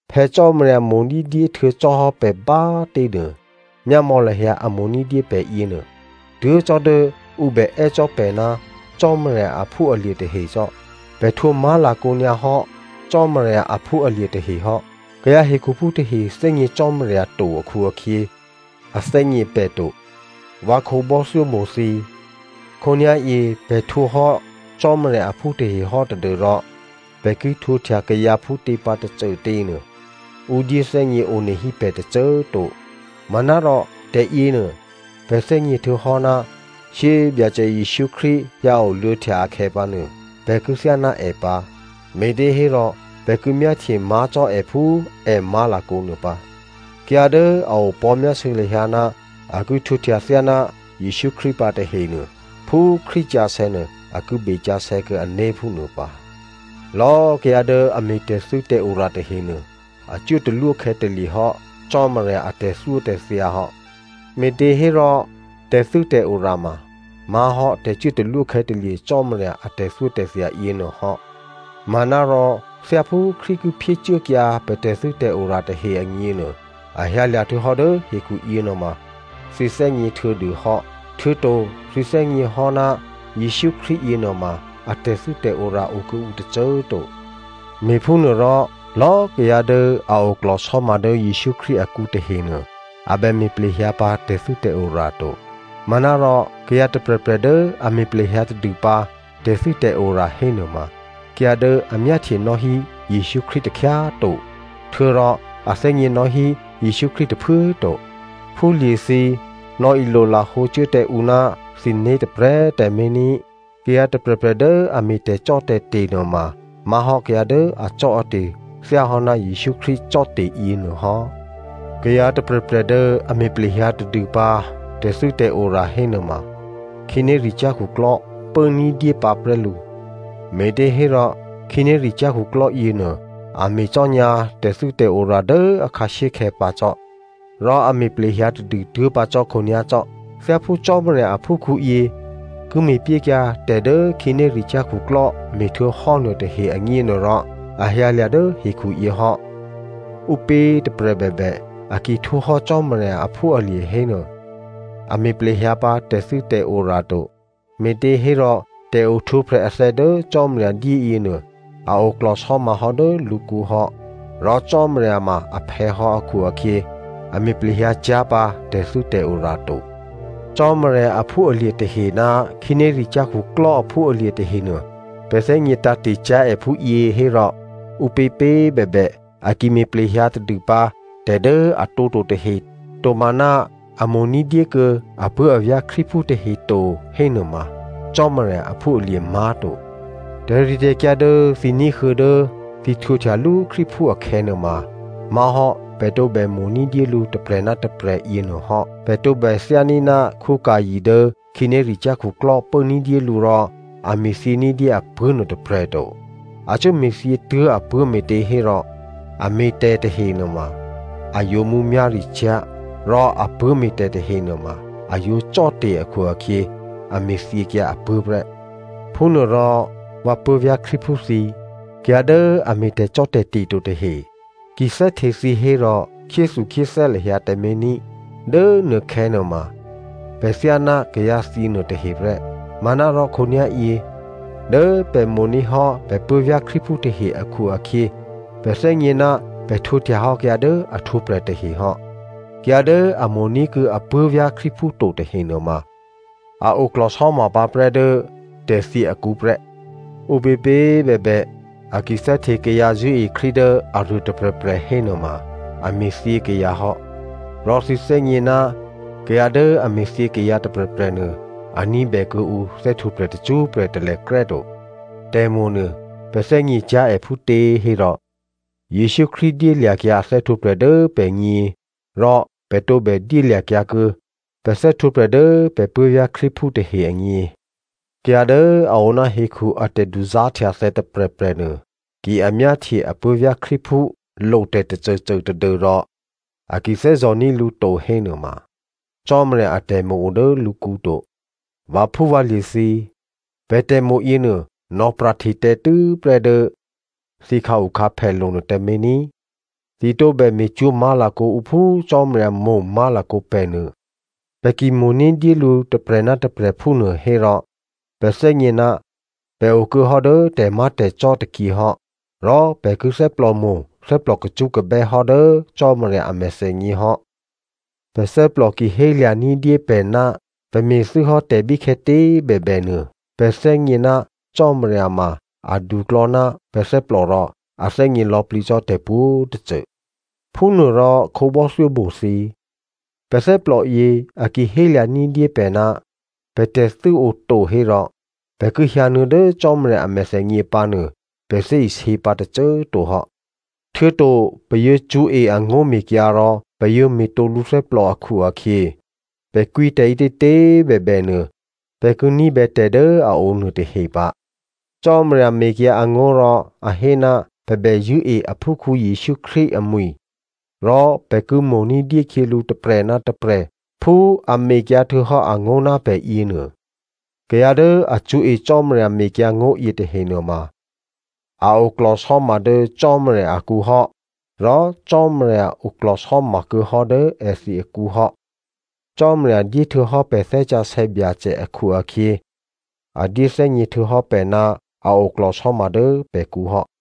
Phè̌ Cò́marya mo̤ ní̤dyé htuô̌ cò́hò́ pè̤ bá꤮ tě nuô, myámò̌ lahyǎ a mo̤ ní̤dyé pè̤ yěnuô, tuố̤ cò́ dố ǔ bè è́ cò́ pè̤ ná Cò́marya aphúalye̤ tahe cò́. Pè̤ htwǒ má̤lakǒ nyǎ hò́ Cò́marya aphúalye̤ tahe hò́. Kayǎ hekhuphú tahe thè́gně Cò́marya to akhu-akhyě, a thè́gně pè̤ to. Vǎ khǒbò́thyómo̤ thǐ꤮, khǒnyá̤yě pè̤ htwǒ hò́ Cò́marya aphú tahe hò́ tadû́rò pè̤ ki htwǒhtya kayǎ phútě pǎ tôcôtě nuô, ǔ dyéthè́gně onehí pè̤ tôcô꤮ to. Manárò, tè̤yěnuô pè̤ thè́gně htuô̌hò́, shyé꤮ Byacè Jesǔ Krístu hyǎoluô̌htya akhè̌ pǎnuô pè̤ ki thyáná è pǎ, me̤těhérò pè̤ ki myáhtye má̤ cò́ è phú è má̤lakǒ nuô pǎ. Kayǎ dố a opò̤́myásû̌ lahyǎ ná a ki htwǒhtya thyáná Jesǔ Krístu pǎ tahenuô, phú Krístu sǎsè̌ nuô, a ki besǎsè̌ kuô̌ ané̤ phúnuô pǎ. Lò̌꤮ kayǎ dố a me̤ tè̤thû́tè̤ora tahenuô, a cuốtalwó khè̌talye̤ hò́ Cò́marya a tè̤thyótè̤thya hò́. Me̤těhérò tè̤thû́tè̤ora ma má̤hò́ tè̤cuốtalwó khè̌talye̤ Cò́marya a tè̤thyótè̤thya yěnuô hò́. Manárò thyáphú Krístu ki phyécuốkyǎ pè̤ tè̤thû́tè̤ora tahe agněnuô, a hyǎlya̤ htuô̌hò́ dố hekhu yěnuôma thǐ thè́gně htuô̌dû hò́. Htuô̌to thǐ thè́gněhò́ ná Jesǔ Krístu yěnuôma a tè̤thû́tè̤ora okuô̌ǔ tôcô꤮ to. Me̤phúnuôrò lò̌꤮ kayǎ dố a oklò̤sò́ma dố Jesǔ Krístu akǔ tahenuô, a bè me̤ plehyǎ pǎ tè̤thû́tè̤ora to. Manárò kayǎ tôprè̤prè̤ dố a me̤ plehyǎ tadûpǎ tè̤thû́tè̤ora hénuôma kayǎ dố a myáhtyenò́ hí Jesǔ Krístu takhyá꤮ to, htuô̌rò a thè́gněnò́ hí Jesǔ Krístu tôphuố꤮ to. Phúlye̤thǐ꤮, nò̌ilolahǒ cuố tǎ ǔ ná thǐné̤ tôprè̤꤮ tǎmé̤ ní꤮. Kayǎ tôprè̤prè̤ dố a me̤ tè̤cò́tè̤te̤ nuôma má̤hò́ kayǎ dố acò́ate̤ thyáhò́ ná Jesǔ Krístu cò́te̤ yěnuô hò́. Kayǎ tôprè̤prè̤ dố a me̤ plehyǎ tadûpǎ tè̤thû́tè̤ora hénuôma, khǐnéricyá̤ khuklò́ pố ní̤dyé pǎprè́ lǔ, me̤těhérò khǐnéricyá̤ khuklò́ yěnuô a me̤cò́nyǎ tè̤thû́tè̤ora dố akhǎshyékhè̌ pǎ cò́, rò a me̤ plehyǎ tadû tuố̤pǎ cò́ khǒnyá̤ cò́. Thyáphú Cò́marya aphúkhǔyě ki me̤pyékyǎ tè̤ dố khǐnéricyá̤ khuklò́ me̤htuô̌hò́ nuôtahe agněnuôrò, a hyǎlya̤ dố hekhuyě hò́. Ǔpě꤮ tôprè̤ bèbè, a ki htwǒhò́ Cò́marya aphúalye̤ hénuô, a me̤ plehyǎ pǎ tè̤thû́tè̤ora to, me̤těhérò tè̤ohtwǒprè̤ athè̌ dố Cò́marya dyé yěnuô a oklò̤sò́mahò́ dố lǔkǔ hò́. Rò Cò́marya ma aphè̌ hò́ akhu-akhyě, a me̤ plehyǎcyá̤ pǎ tè̤thû́tè̤ora to. Cò́marya aphúalye̤ tahe ná khǐnéricyá̤ khuklò́ aphúalye̤ tahenuô, pè̤ thè́gně tǎ̤te̤ cyá̤ è phúyě hò́rò, ǔpěpě꤮ bèbè a ki me̤ plehyǎ tadûpǎ tè̤ dố a tǒto tahe, tomaná a mo̤ ní̤dyé kuô̌ apuố̤avyá̤ Krístuphú tahe to hénuôma Cò́marya aphúalye̤ má̤to. Tè̤ritè̤kyǎ dố thǐ ní̤huô̌ dố thǐ htwǒhtyalú Krístuphú akhè̌nuôma má̤hò́ pè̤ tǒbè mo̤ ní̤dyé lǔ tôprè̤ ná tôprè̤ yěnuô hò́. Pè̤ tǒbè thyání̤ ná Caino dố khǐnéricyá̤ khuklò́ pố ní̤dyé lǔ rò a me̤thyě ní̤dyé apuố̤ nuôtôprè̤ to. A cuố me̤thyě tuố̤ apuố̤ me̤těhérò a me̤tè̤ tahe nuôma a yǒ mǔmyá̤ricyá̤ rò apuố̤ me̤tè̤ tahe nuôma a yǒ cò́te̤ akhu-akhyě a me̤thyěkyǎ apuố̤ prè́. Phúnuôrò vǎ puố̤vyá̤ Krístuphú thǐ꤮, kayǎ dố a me̤ tè̤cò́tè̤te̤ to tahe ki thè́hte thǐ hérò khyéthukhyéthè́ lahyǎ tǎmé̤ ní꤮. Dố nuôkhè̌ nuôma pè̤ thyáná kayǎthyě nuôtahe prè́. Manárò khǒnyá̤yě dố pè̤ mo̤ní̤ hò́ pè̤ puố̤vyá̤ Krístuphú tahe akhu-akhyě, pè̤ thè́gně ná pè̤ htwǒhtyahò́ kayǎ dố a htwǒprè̤ tahe hò́. Kayǎ dố a mo̤ní̤kuô̌ apuố̤vyá̤ Krístuphú to tahe nuôma a oklò̤sò́ma pǎprè́ dố tè̤thyě akǔ prè́. Ǔpěpě꤮ bèbè a ki thè́hte kayǎ zṳ̂́e Krístu dố aruô tôprè̤prè̤ hénuôma, a me̤thyě kayǎ hò́. Rò thǐ thè́gně ná kayǎ dố a me̤thyě kayǎ tôprè̤prè̤ nuô, a ní̤bè kuô̌ǔ thè́htwǒprè̤ tacṳ́prè̤ talèkrè́ to. Tè̤mo̤nuô pè̤ thè́gněcyá̤ è phútě hérò, Jesǔ Krístu dyélya̤kyǎ a thè́htwǒprè̤ dố pè̤gně, rò pè̤ tǒbè dyélya̤kyǎ kuô̌ pè̤ thè́htwǒprè̤ dố pè̤ puố̤vyá̤ Krístuphú tahe agně. Kayǎ dố a oná hekhu a tè̤duzá̤htyathè̌ tôprè̤prè̤ nuô, ki a myáhtye apuố̤vyá̤ Krístuphú lo tè̤tôcôcô tadû́rò a ki thè́zò̤ní̤ lǔ to hénuôma, Cò́marya atè̤mo̤ o dố lǔkǔ to. Vǎphúvǎlye̤ thǐ꤮, pè̤ tè̤mo̤ yěnuô nò̌pra̤hte tǎ tû́prè́ dố thǐ khǎukhǎphèlo̤ nuô tǎmé̤ ní꤮. Thǐ tǒbè me̤cwó̤ má̤lakǒ ǔ phú Cò́marya mo̤ má̤lakǒ pè̤ nuô. Pè̤ ki mo̤ ní̤dyé lǔ tôprè̤ ná tôprè̤ phúnuô hérò pè̤ thè́gně ná pè̤ okuô̌hò́ dố tè̤má̤tè̤cò́ tôkyě hò́. Rò pè̤ ki thè́plòmo̤, thè́plò kacṳ́kabè́ hò́ dố Cò́marya a mèthènyě hò́. Pè̤ thè́plò ki hélya̤ ní̤dyé pè̤ ná pè̤ me̤thû́ hò́ tè̤ bíkhè̌tě꤮ bèbè nuô, pè̤ thè́gně ná Cò́marya ma aduklò̌ ná pè̤ thè́plò rò a thè́gně lò̌plǐ cò́ tè̤pwǒ̤tôcô. Phúnuôrò khǒbò́thyómo̤ thǐ꤮, pè̤ thè́plò yě, a ki hélya̤ ní̤dyé pè̤ ná pè̤ tè̤thû́ oto hérò, pè̤ ki hyǎnuô̌ dố Cò́marya a mèthènyě pǎnuô, pè̤ thè́isě pǎ tôcô꤮ to hò́. Htuô̌to pè̤ yǒ cṳ̌e angó̤mekyǎ rò pè̤ yǒ me̤tǒ lǔthè́plò akhu-akhyě, pè̤ kwǐ tè̤ ǐtětě꤮ bèbè nuô, pè̤ ki ní̤bè tè̤ dố a o nuôtahe pǎ. Cò́marya mekyǎ angó̤ rò a hé, pè̤ bè zṳ̂́e aphúkhǔ Jesǔ Krístu amwi̤ rò pè̤ ki mo̤ ní̤dyé khyělǔ tôprè̤ ná tôprè̤ phú a mekyǎ htuô̌hò́ angó̤ ná pè̤ yěnuô. Kayǎ dố a cṳ̌e Cò́marya mekyǎngó̤ yětahe nuôma a oklò̤sò́ma dố Cò́marya akǔ hò́, rò Cò́marya oklò̤sò́ma kuô̌hò́ dố èthǐ akǔ hò́. Cò́marya dyé htuô̌hò́ pè̤ Thè́ Sǎsè̌ Byacè akhu-akhyě, a dyéthè́gně htuô̌hò́ pè̤ ná a oklò̤sò́ma dố pè̤kǔ hò́.